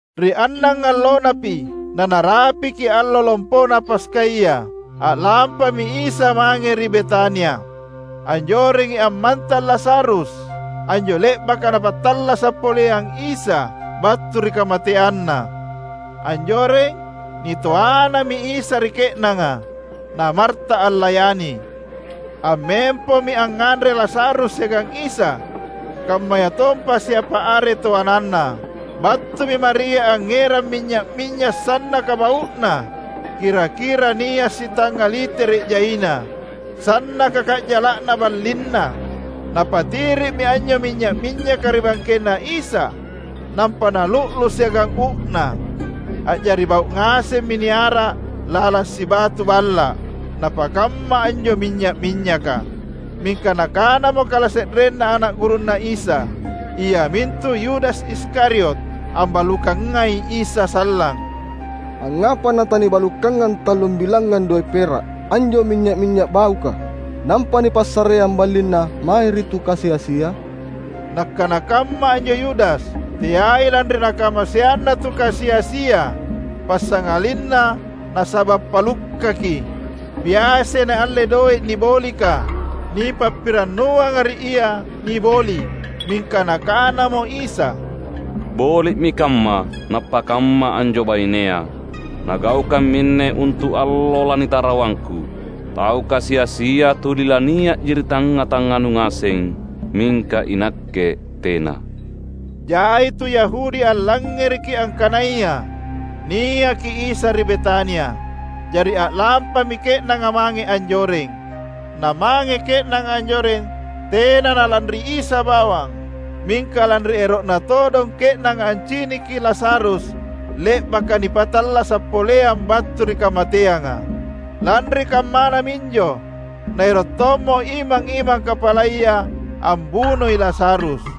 Ri annangallonapi nanarapiki Allo Lompona Paskaya, a’lampami Isa mange ri Betania. Anjorengi ammantang Lazarus, anjo le’baka Napattallasa’ poleang Isa battu ri kamateanna. Anjoreng, nitoanami Isa ri ke’nanga, na Marta allayani. Ammempomi angnganre Lazarus siagang Isa, kammayatompa siapa are toananna. Battumi Maria angngerang minynya’-minynya’ sannaka bau’na, kira-kira nia’ sitangnga litere’ jaina, sannaka ka’jala’na ballinna. Napatiri’mi anjo minynya’-minynyaka ri bangkenNa Isa, nampa nalu’lu’ siagang uu’na. A’jari bau’ ngasemmi niara’ lalang sibatu balla’ napakamma anjo minynya’-minynyaka. Mingka nakanamo kalase’renna ana’ gurunNa Isa, iamintu Yudas Iskariot — ambalukangai Isa sallang –, "Angngapa natanibalukanga tallum bilangngang doe’ pera’ anjo minynya’-minynya’ bauka, nampa nipassareang ballinna mae ri tu kasi-asia?" Nakkana kamma anjo Yudas, teai lanri nakamaseanna tu kasi-asia, passangalinna nasaba’ palukkaki. Biasai naalle doe’ nibolika, nipappirannuanga ri ia niboli’. Mingka Nakanamo Isa, "Boli’mi kamma nappakamma anjo bainea! Nagaukang minne untu’ allo lanitarawangKu. Tau kasi-asia tuli lania’ji ri tangnga-tangnganu ngaseng, mingka iNakke tena." Jai tu Yahudi allangngereki angkanaya niaki Isa ri Betania. Jari a’lampami ke’nanga mange anjoreng. Namange ke’nanga anjoreng tena nalanri Isa bawang, mingka lanri ero’na todong ke’nanga anciniki Lazarus le’baka nipattallasa’ poleang battu ri kamateanga. Lanri kammana minjo naero’ tommo imang-imang kapalaya ambunoi Lazarus.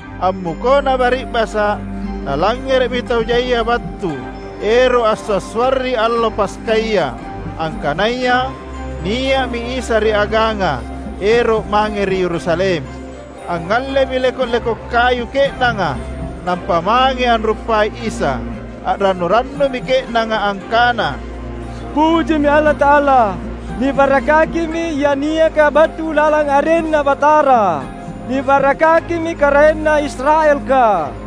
Ammukona bari’basa’ nalangngere’mi tau jaia battu ero’ ansua’-suarri allo Paskaya, angkanaya nia’mi Isa ri aganga ero’ mange ri Yerusalem. Angngallemi leko’-leko’ kayu ke’nanga nampa mange anruppai Isa. A’rannu-rannumi ke’nanga angkana, "Pujimi Allata’ala! Nibarakkakimi Ia niaka battu lalang arenNa Batara. Nibarakkakimi KaraenNa Israelka!"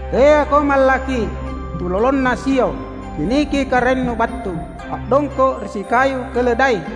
"Teako mallakki, tulolonna Sion! Ciniki Karaennu battu, a’dongko’ ri sikayu keledai!"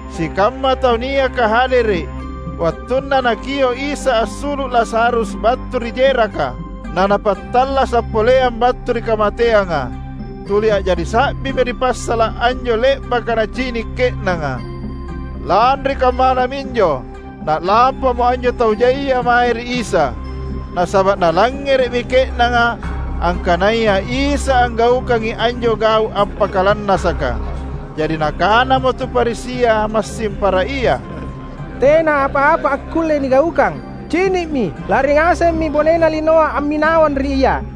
Sikamma tau niaka hadere’ wattunna Nakio’ Isa assulu’ Lazarus battu ri jeraka, na Napattallasa’ poleang battu ri kamateanga, tuli a’jari sa’bimi ri passala’ anjo le’baka nacini’ ke’nanga. Lanri kammana minjo na’lampamo anjo tau jaia mae ri Isa; nasaba’ nalangngere’mi ke’nanga angkanaya Isa anggaukangi anjo gau’ appakalannasaka. Jari nakanamo tu Farisia massing para ia, "Tena apa-apa akkulle nigaukang! Cini’mi lari ngasemmi bonena linoa amminawang ri Ia!"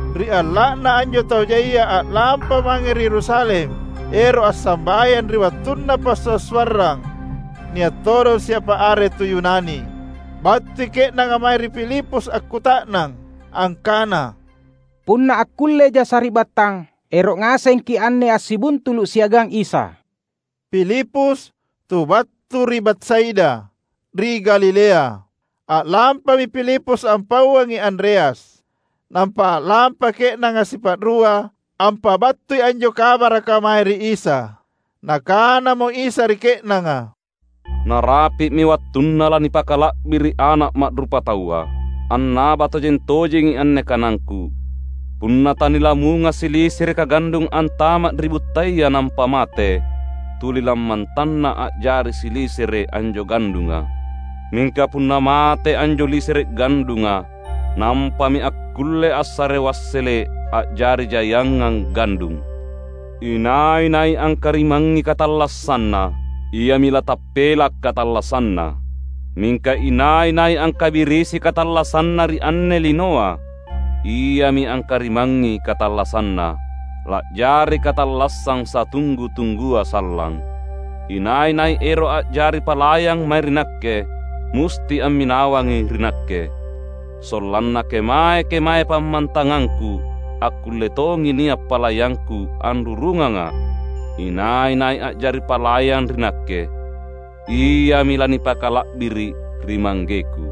Ri alla’na anjo tau jaia a’lampa mange ri Yerusalem ero’ assambayang ri wattunna passua’-suarrang, nia’ todong siapa are tu Yunani. Battui ke’nanga mae ri Filipus akkuta’nang, angkana, "Punna akkulleja sari’battang, ero’ ngasengki’ anne assibuntulu’ siagang Isa." (Filipus, tu battu ri Betsaida, ri Galilea.) A’lampami Filipus ampauangi Andreas. Nampa a’lampa ke’nanga sipa’rua ampabattui anjo kabaraka mae ri Isa. Nakanamo Isa ri ke’nanga, "Narapi’mi wattunna lanipakala’biri’ Ana’ Ma’rupataua. Annaba tojeng-tojengi anne kanangKu: Punna tanilamunga silisereka gandung antama’ ri buttaya nampa mate, tuli lammantanna a’jari silisere’ anjo gandunga. Mingka punna mate anjo lisere’ gandunga, nampami akkulle assare wassele’ a’jari jaiangang gandung. Inai-nai angkarimangngi katallassanna, iami latappela’ katallassanna. Mingka inai-nai angkabirisi katallassanna ri anne linoa, iami angkarimangngi katallassanna, la’jari katallassang satunggu-tunggua sallang. Inai-nai ero’ a’jari palayang mae ri Nakke, musti amminawangi ri Nakke; sollanna kemae-kemae pammantangangKu akkulle tongi nia’ palayangKu anrurungangA’. Inai-nai a’jari palayang ri Nakke, iami lanipakala’biri’ ri ManggeKu."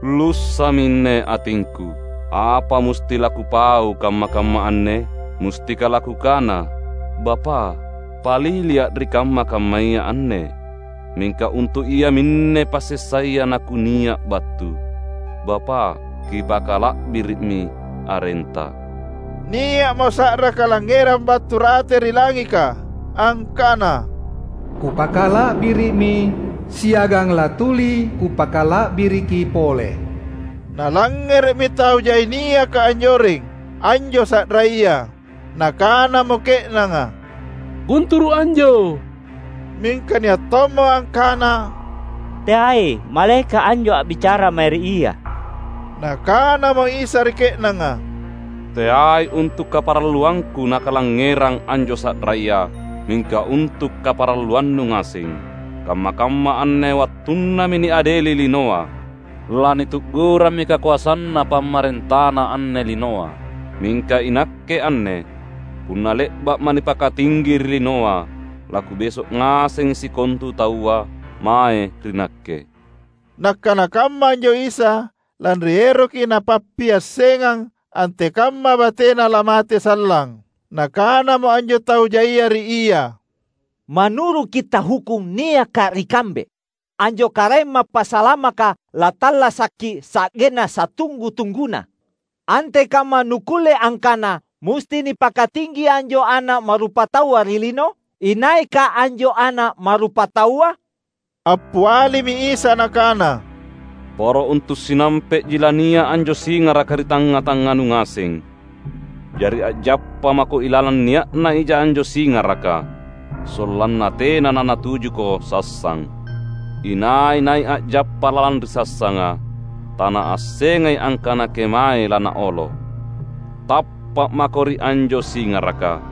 "Lussa’minne atingKu: apa musti laKupau kamma-kamma anne? Mustika laKukana, ‘Bapa’, paliliA’ ri kamma-kammaya anne’? Mingka untu’ iaminne passessaya naKunia’ battu. Bapa’, Kipakala’biri’mi arenTa!" Nia’mo sa’ra kalangngerang battu rate ri langika angkana, "Kupakala’biri’mi, siagang latuli Kupakala’biriki pole." Nalangngere’mi tau jai niaka anjoreng anjo sa’raya. Nakanamo ke’nanga, "Gunturu’ anjo!" Mingka nia’ tommo angkana, "Teai! Malaeka’ anjo a’bicara mae ri Ia!" Nakanamo Isa ri ke’nanga, "Teai untu’ kaparalluangKu nakalangngerang anjo sa’raya, mingka untu’ kaparalluannu ngaseng. Kamma-kamma anne wattunnami niadeli linoa; lanitu’gurammi kakoasanna pamarentana anne linoa. Mingka iNakke anne, punna le’ba’Ma’ nipakatinggi ri linoa, laKubeso’ ngasengi sikontu taua mae ri Nakke." Nakkana kamma anjo Isa, lanri eroki Napappiassengang antekamma bateNa lamate sallang. Nakanamo anjo tau jaia ri Ia, "Manuru’ Kitta’ Hukkung niaka ri kambe, anjo Karaeng Mappasalamaka lattallasaki sa’genna satunggu-tungguna. Antekamma Nukkulle angkana musti nipakatinggi anjo Ana’ Ma’rupataua ri lino? Inaika anjo Ana’ Ma’rupataua?" Appialimi Isa Nakana, "Poro untu’ sinampe’ji lania’ anjo singaraka ri tangnga-tangnganu ngaseng. Jari a’jappa mako ilalang nia’na ija anjo singaraka, sollanna tena nanatujuko sassang. Inai-nai a’jappa lalang ri sassanga, tanaassengai angkana kemae lanaolo. Tappa’ mako ri anjo singaraka,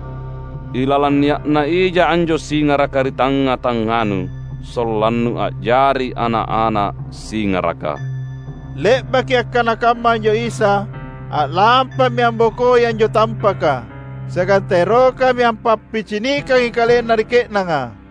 ilalang nia’na ija anjo singaraka ri tangnga-tangnganu, sollannu a’jari ana’-ana’ singaraka." Le’baki akkana kamma anjo Isa, a’lampami ambokoi anjo tampaka, siagang taerokami ampappicinikangi KalenNa ri ke’nanga.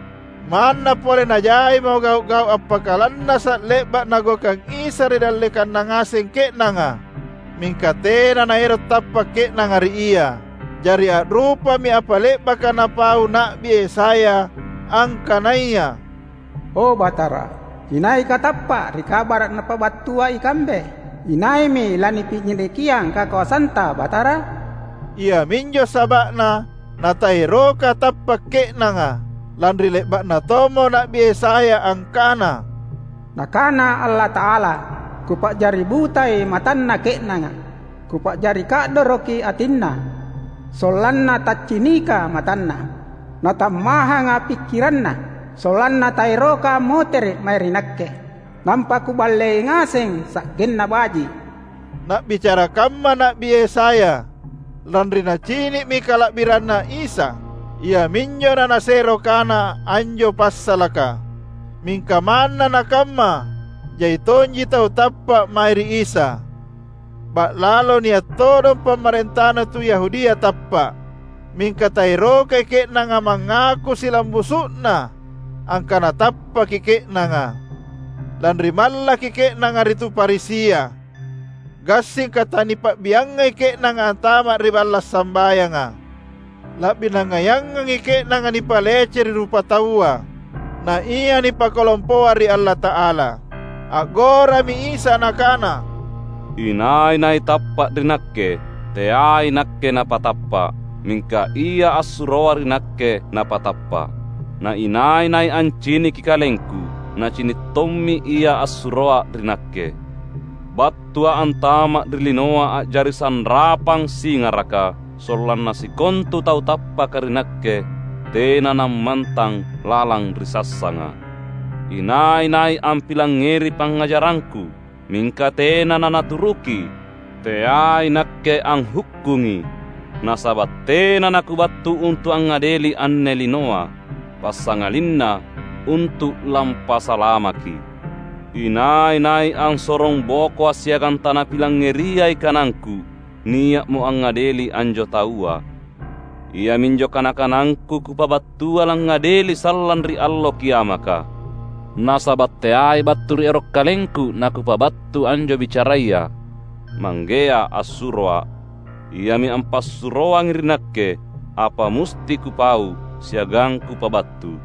Manna pole najaimo gau’-gau’ appakalannasa’ le’ba’ Nagaukang Isa ri dallekanna ngaseng ke’nanga, mingka tena naero’ tappa’ ke’nanga ri Ia. Jari a’rupami apa le’baka napau Na’bi Yesaya angkanaya, "O Batara, inaika tappa’ ri kabara’ napabattua ikambe? Inaimi lanipicinikiang kakoasanTa Batara?" Iaminjo saba’na nataeroka tappa’ ke’nanga, lanri le’ba’na tommo Na’bi Yesaya angkana: "Nakana Allata’ala, ‘Kupa’jari butai matanna ke’nanga, Kupa’jari ka’doroki atinna; sollanna taccinika matanna, natammahanga pikkiranna. Sollanna taeroka ammotere’ mae ri Nakke, nampa Kuballei ngaseng sa’genna baji’.’" Na’bicara kamma Na’bi Yesaya, lanri nacini’mi kala’biranNa Isa. Iaminjo nanasero kana anjo passalaka. Mingka manna nakamma, jai tonji tau tappa’ mae ri Isa; ba’lalo nia’ todong pamarentana tu Yahudia tappa’. Mingka taerokai ke’nanga mangaku silambusu’na angkana tappaki ke’nanga; lanri mallaki ke’nanga ri tu Farisia, gassingka tanipa’biangai ke’nanga antama’ ri balla’ sambayanga. La’bi nangaiangangi ke’nanga nipalece ri rupataua, naia nipakalompoa ri Allata’ala. A’gorami Isa Nakana, "Inai-nai tappa’ ri Nakke, teai Nakke napatappa’, mingka Ia assuroa ri Nakke napatappa’. Na inai-nai anciniki KalengKu, nacini’ tommi Ia assuroa ri Nakke. BattuA’ antama’ ri linoa a’jari sanrapang singaraka, sollanna sikontu tau tappaka ri Nakke tena nammantang lalang ri sassanga. Inai-nai ampilangngeri pangngajarangKu, mingka tena nanaturuki, — teai Nakke anghukkungi. Nasaba’ tena naKubattu untu’ angngadeli anne linoa, passangalinna untu’ lampasalamaki. Inai-nai ansorongbokoA’ siagang tanapilangngeriai kanangKu, nia’mo angngadeli anjo taua. Iaminjo kana-kanangKu Kupabattua langngadeli sallang ri Allo Kiamaka. Nasaba’ teai battu ri ero’ KalengKu naKupabattu anjo bicaraya; Manggea assuroA’, Iami ampassuroangi ri Nakke apa musti Kupau siagang Kupabattu.